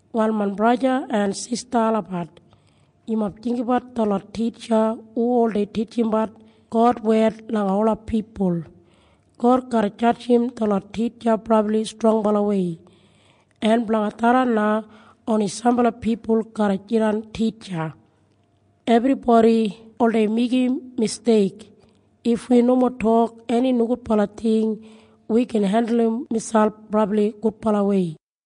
Wal main braja en sista olabat, yumob jinggabat detlot titja hu oldei titjimbat God wed langa ola pipul. God garra jadjim detlot titja brabli strongbalawei, en blanga tharran na oni sambala pipul garra jidan titja. Ebribodi oldei meigim misteik. If wi nomo tok eni nogudbala ting wi gin hendulum miselp brabli gudbalawei.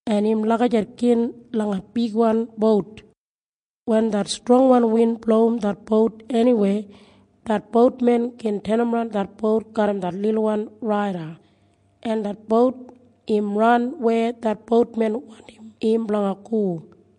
En im lagijat gin langa bigwan bout. Wen det strongwan win blowim det bout eniwei, det boutmen gin tenimran det bout garram det lilwan rada, en det bout im ran weya det boutmen wandim im blanga go.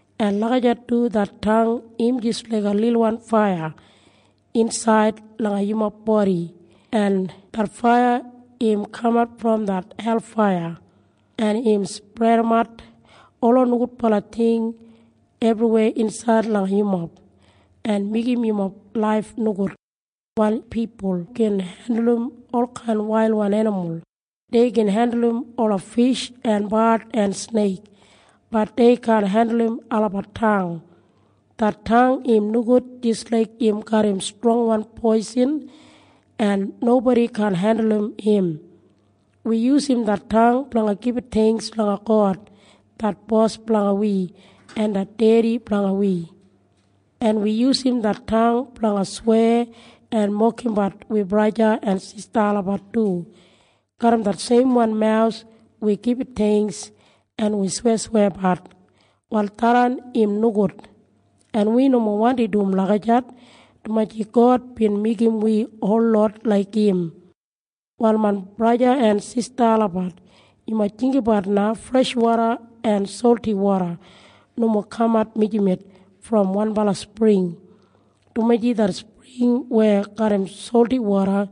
En lagijat du det tang im jis laiga lilwan faiya insaid langa yumob bodi, en det faiya im kamat brom det helfaiya, en im spredimat ola nogudbala ting ebriweya insaid langa yumob, en im meigim yumob laif nogud. Wal pipul gin hendulum olkain wailwan enimul. Dei gin hendulum ola fish en bard en sneik. Bat dei kaan hendulum olabat tang. Det tang im nogud jis laik im garram strongwan poisin, en nobodi kaan hendulum im. Wi yusum det tang blanga gibit theingks langa God det Bos blanga wi en det dedi blanga wi. En wi yusum det tang blanga sweya en mokimbat wi braja en sista olabat du. Garram det seimwan mawus wi gibit theingks en wi sweyasweyabat. Wal tharran im nogud, en wi nomo wandi dum lagijat, dumaji God bin meigim wi holot laik im. Wal main braja en sista olabat, yumob jinggabat na. Freshwoda en solti woda nomo kamat mijamet brom wanbala spring, dumaji det spring weya garram solti woda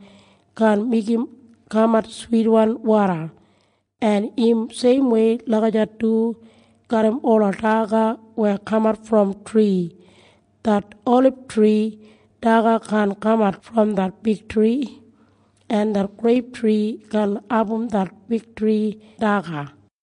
kaan meigim kamat switwan woda. En im seimwei lagijat du garram ola daga weya kamat brom tri. Det olibtri daga kaan kamat brom det figtri, en det greiptri kaan abum det figtri daga.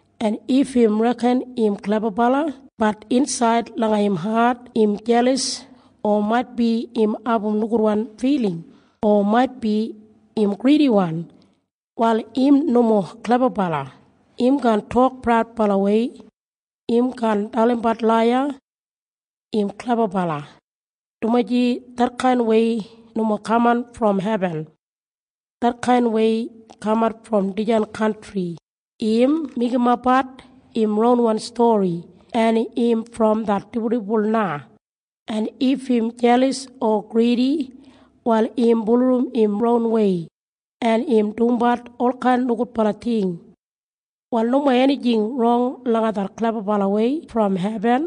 En if im reken im klebabala, bat insaid langa im hat im jelas o maitbi im abum nogudwan filing o maitbi im gridiwan, wal im nomo klebabala. Im kaan tok praudbalawei. Im kaan dalimbat laiya im klebabala, dumaji detkainwei nomo kaman brom hebin. Detkainwei kamat brom dijan kantri. Im meigimapbat im ronwan stori, en im brom det dibuldibul na. En if im jelas en gridi, wal im bulurrum im ronwei, en im dumbat olkain nogudbala ting. Wal nomo enijing rong langa det klebabalawei brom hebin,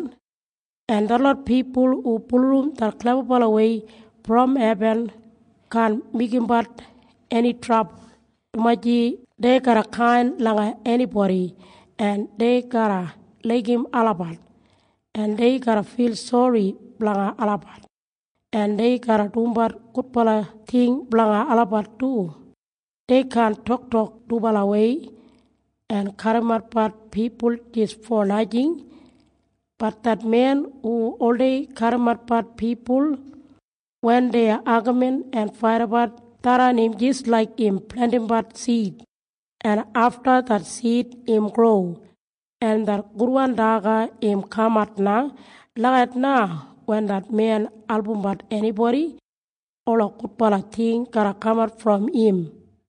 en detlot pipul hu bulurrum det klebabalawei brom hebin kaan meigimbat eni trabul, dumaji dei garra kain langa enibodi, en dei garra laigim olabat, en dei garra fil sori blanga olabat, en dei garra dumbat gudbala ting blanga olabat du. Dei kaan toktok dubalawei en kadimatbat pipul jis fo najing. Bat det men hu oldei kadimatbat pipul wen dei agamin en faidabat, tharran im jis laik im plentimbat sid, en afta det sid im gro, en det gudwan daga im kamat na. Lagijat na wen det men albumbat enibodi, ola gudbala ting garra kamat brom im.